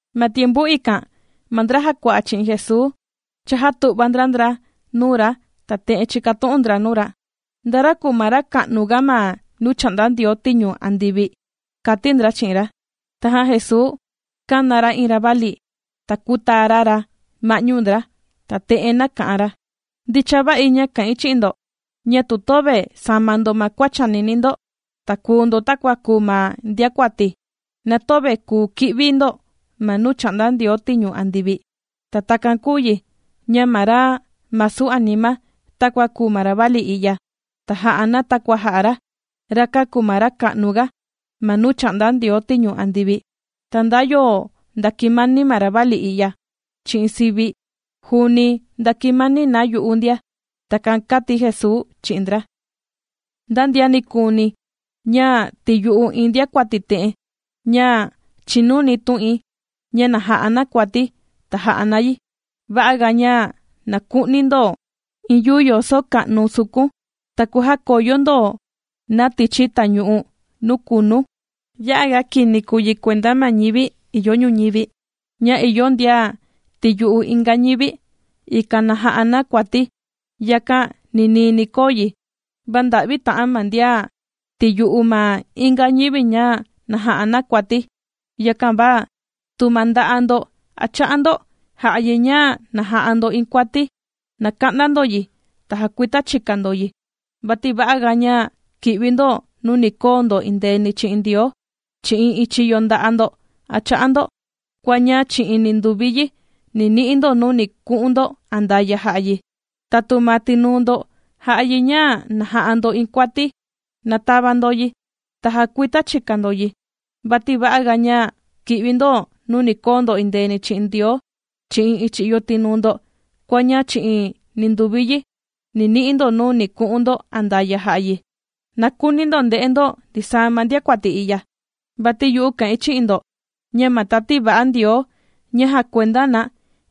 Ma tiempu ikan ma ndra jàkua'a chi'in Jesuu chājatu'va ndra ndra nuu ra, ta te'en chīkatu'un ndra nuu ra: ―¿Nda ra kùu ma ra ka'nu ga ma nuu chà'nda Ndioo tiñu andivi? ―kàti ndra chi'in ra. Tajan Jesuu kāna ra iin ravali, ta kūtaa ra ra ma'ñu ndra, ta te'en nāka'an ra: ―Ndicha va'i ña kà'in chi'in ndo, ña tu töve sama ndo ma kua chànini ndo, ta kùu ndo takua kùu ma ndiakuati, na töve kùu ki'vi ndo ma nuu chà'nda Ndioo tiñu andivi. Ta takan kùu yi ña ma ra masu anima takua kùu ma ravali i'ya, ta jà'a na takua jà'a ra, rakan kùu ma ra ka'nu ga ma nuu chà'nda Ndioo tiñu andivi. Ta nda yo ndàkimani ma ravali i'ya chi'in sivi̱, juuni ndakimani na yu'u ndia. ―Takan kàti Jesuu chi'in ndra. ―Nda ndian nikuuni ña tìyu'u iin ndiakuati te'en, ña chìnuni tu'in, ña na ja'a na kuati, ta jà'a na yi. Va'a ga ña na ku'ni ndo iin yuu yoso ka'nu sukun, ta kujakoyo ndo na tichi tañu'u nuu kunu. ¡Ya'a ga kini kùu yi kuenda ma ñivi ìyo ñuñivi, ña ìyo ndian tìyu'u inga ñivi, ikan na ja'a na kuati! Yakan ninii ni koo yi, va ¡nda'vi ta'an ma ndian tìyu'u ma inga ñivi ña na ja'a na kuati! ’Yakan va tu ma nda'a' ndo a cha'a ndo, jà'a yi ña na ja'a ndo iin kuati, na ka'nda ndo yi, ta jakuita chika ndo yi, vati va'aga ña ki'vi ndo nuu ni koo ndo endeeni chi'in Ndioo, chi'in iin chiyo nda'a' ndo a cha'a ndo, kua ña chi'in ninduvi yi ni ni'i ndo nuu ni ku'un ndo andaya' jà'a yi. Tatu ma tinuu ndo jà'a yi ña na ja'a ndo iin kuati, na tava ndo yi, ta jakuita chika ndo yi, vati va'aga ña kì'vi ndo nuu ni koo ndo endeeni chi'in Ndioo, chi'in iin chiyo tinuu ndo, kua ña chi'in ninduvi yi ni ni'i ndo nuu ni ku'un ndo andaya' jà'a yi. ’Na kuuni ndo nde'e ndo ndisaa ma ndiakuati i'ya. Vati yu'u kà'in chi'in ndo ña ma tati va'a Ndioo ña jakuenda na,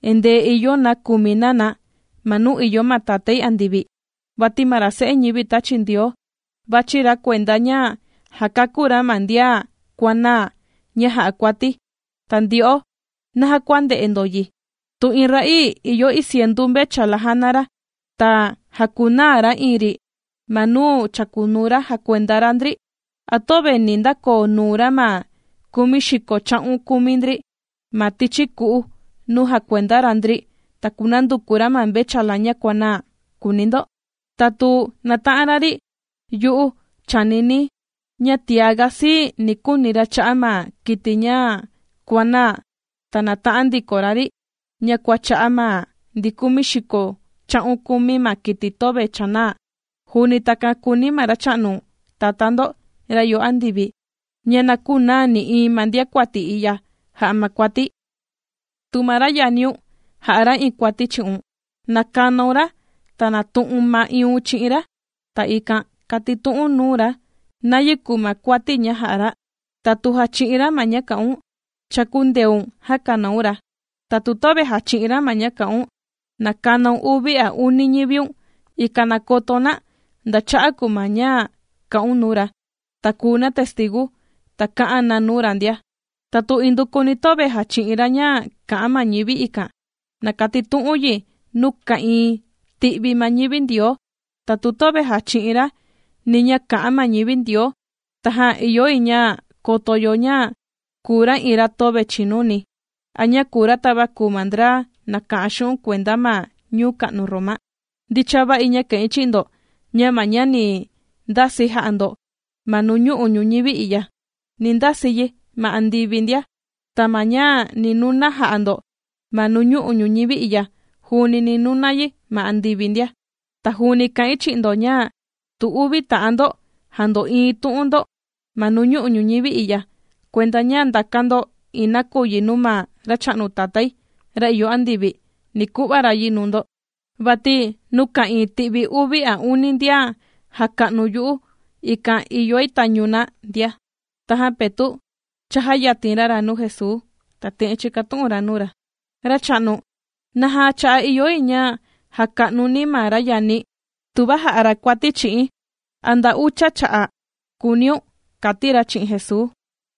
endee ìyo na kùmi na na ma nuu ìyo ma Tatái andivi. Vati ma ra Se'e ñivi tāchi Ndioo, vàchi ra kuenda ña jakakú ra ma ndian kuànaa ña jà'a kuati. ’Ta ndyo'o, ¿naja kua ndè'e ndo yi? Tu iin ra'ii ìyo iin cientu mvechala jàna ra, ta jàkunaa ra iin ri ma nuu chàkunuu ra jakuenda ra ndri, ¿a töve ni ndakoo nuu ra ma kumi xiko cha'un kumi ndri ma tichi ku'u nuu jàkuenda ra ndri, ta kunanduku ra ma mvechala ña kuànaa?, kùuni ndo. Tatu nàta'an ra ri, yu'u chànini̱ ña tiaga sii ni kuuni ra cha'a' ma kiti ña kuànaa ta nāta'an ndiko ra ri, ña kua cha'a' ma ndi kumi xiko cha'un kumi ma kiti töve chànaa. Juuni takan kùuni ma Racha'nu Tatá ndo, ra ìyo andivi, ña na künaa nï'iin ma ndiakuati i'ya jà'a ma kuati. ’Tu ma ra yaniun ja'a ra iin kuati chi'un, na kanaun ra, ta natu'un ma'iiun chi'in ra, ta ikan katitu'u̱n nuu ra nayi kùu ma kuati ña jà'a ra. Tatu jachi'in ra ma ña kà'un, cha kūndeun jakanaun ra. Tatu töve jàchi'in ra ma ña kà'un, na kanaun uvi a uni ñiviun, ikan na koto na nda cha'a' kùu ma ña kà'un nuu ra, ta kùu na testigu, ta kā'an na nuu ra ndia. Tatu indukuni töve jàchi'in ra ña kà'an ma ñivi ikan, na katitu'u̱n yi nuu ka'ìin ti'vi ma ñivi Ndioo. Tatu töve jàchi'in ra, ni ña kà'an ma ñivi Ndioo, tajan ìyo yi ña koto yo ña kùu ra iin ra töve chìnuni, a ña kùu ra tava kùu ma ndra nàka'an xu'un' kuenda ma ñuu ka'nu Roma. ’Ndicha va'i ña kà'in chi'in ndo, ña ma ña ni kasi ndo ma nuñu'u' ñuñivi i'ya, ni ndasi yi ma andivi ndia. Ta ma ña ni nuna jà'a ndo ma nuñu'u' ñuñivi i'ya, juuni ni nuna yi ma andivi ndia. ’Ta juuni kà'in chi'in ndo, ña tu uvi ta'an ndo jàndo'iin tu'un ndo ma nuñu'u' ñuñivi i'ya, kuenda ña ndākan ndo iin nakuyi nuu ma Racha'nu Tatái, ra ìyo andivi, ni ku'va ra yi nuu ndo. Vati nuu ka'ìin ti'vi uvi a uni ndian jàka'nu yu'u, ikan ìyoi tañu na ndia. Tajan Petu' chājayatin ra ra nuu Jesuu, ta te'en chīkatu'un ra nuu ra: ―Racha'nu, ¿naja cha'a' ìyo yi ña jaka'nuni̱ ma ra yani̱, tuva jà'a ra kuati chi'i̱n? ¿A nda ucha cha'a'?, kùuniun ―kàti ra chi'in Jesuu.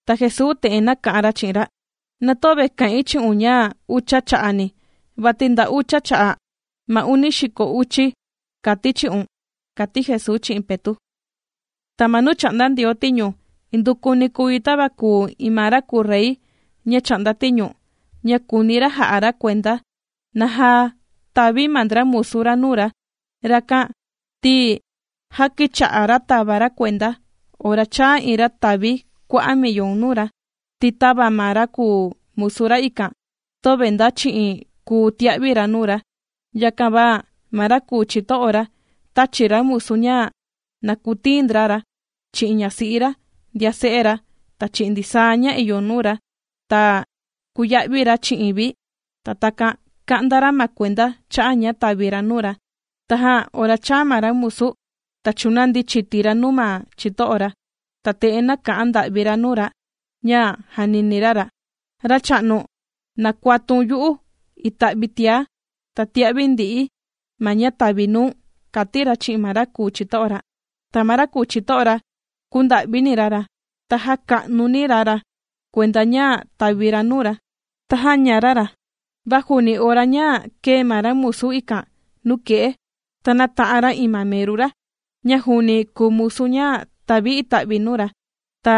Ta Jesuu te'en nāka'an ra chi'in ra: ―Na töve kà'in chi'un ña ucha cha'ani, vati nda ucha cha'a' ma uni xiko uchi kàti̱ chi'un ―kàti Jesuu chi'in Petu'. ’Ta ma nuu chà'nda Ndioo tiñu, indukuni kùu yi tava kùu iin ma ra kùu rey ña chà'nda tiñu, ña kūuni ra jà'a ra kuenda, naja tàvi ma ndra musu ra nuu ra. Rakan, ti já kīcha'a ra tàva ra kuenda, ora chāa iin ra tàvi kua'a' millon nuu ra. Ti tava ma ra kùu musu ikan, töve nda chi'in kùu tia'vi ra nuu ra, yakan va ma ra kùu chito'o ra tāchi ra musu ña na kutiin ndra ra, chi'in ñasi'i ra, ndian se'e ra, ta chi'in ndisaa ña ìyo nuu ra, ta kūya'vi ra chi'in vi, ta takan ka'nda ra ma kuenda cha'a ña tàvi ra nuu ra. Tajan ora chāa ma ra musu, ta chūnandi chiti ra nuu ma chito'o ra, ta te'en nāka'an nda'vi ra nuu ra ña jànini ra ra: “Racha'nu, na kuatun yu'u ita'vi tiá, ta tia'vi ndi'i̱ ma ña tavi̱ nuu̱n”, kàti ra chi'in ma ra kùu chito'o ra. Ta ma ra kùu chito'o ra kūnda'vini ra ra, ta jāka'nuni ra ma kuenda ña tàvi ra nuu ra, ta jāña ra ra. Va juuni ora ña kèe ma ra musu ikan nuke'e, ta nāta'an ra iin ma meru ra, ña juuni kùu musu ña tàvi ita'vi nuu ra, ta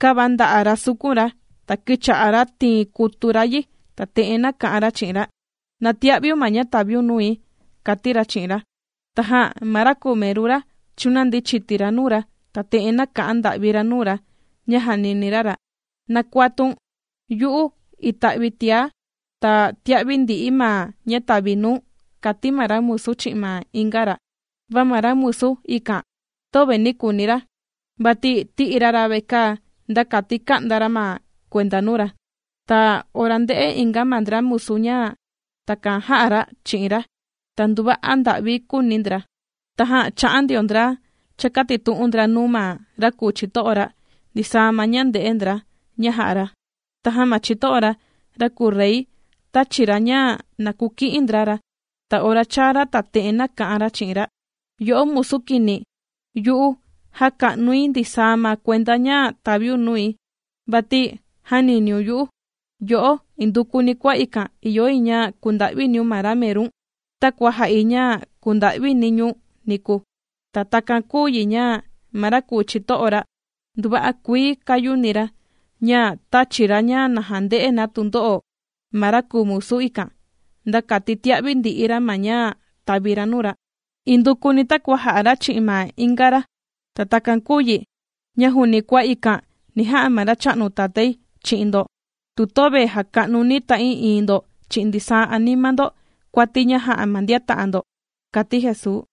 kāvanda'a ra sukun ra, ta kīcha'a ra tiin kutu ra yi, ta te'en nāka'an ra chi'in ra: “¡Na tia'viun ma ña tàviun nui!”, kàti ra chi'in ra. Tajan ma ra kùu meru ra chūnandi chiti ra nuu ra, ta te'en nāka'an nda'vi ra nuu ra ña jànini ra ra: “Na kuatun yu'u ita'vi tiá, ta tia'vi ndi'i̱ ma ña tavi̱ nuu̱n”, kàti ma ra musu chi'in ma inga ra. Va ma ra kùu musu ikan, töve nī küuni ra, vati tī'i ra ra vekaa nda kati ka'nda ra ma kuenda nuu ra. Ta ora ndē'e inga ma ndra musu ña takan jā'a ra chi'in ra, ta nduva'a nda'vi kūuni ndra. Tajan chā'an ndio ndra chākatitu'un ndra nuu ma ra kùu chito'o ra, ndisaa ma ña ndē'e ndra ña jā'a ra. Tajan ma chito'o ra, ra kùu rey tāchi ra ña na kuki'in ndra ra, ta ora chāa ra ta te'en nāka'an ra chi'in ra: “¡Yo'o musu kini! Yu'u jāka'nuni̱ ndisaa ma kuenda ña tàviun nui, vati jāniniun yu'u. Yo'o, indukuni kua ikan ìyo yi ña kunda'viniun ma ra merun, takua jā'i ña kūnda'vini̱ ñu̱n niku.” Ta takan kùu yi ña ma ra kùu chito'o ra nduva'a kuii kāyuni ra, ña tāchi ra ña na jande'e na tundo'o ma ra kùu musu ikan, nda kati tia'vi ndi'i ra ma ña tàvi ra nuu ra, indukuni takua jā'a ra chi'in ma inga ra. Ta takan kùu yi, ña juuni kua ikan ni ja'a ma Racha'nu Tatái chi'in ndo, tu töve jaka'nuni ta'ii'iin ndo chi'in ndisaa anima ndo kuati ña jà'a ma ndian ta'an ndo ―kàti Jesuu.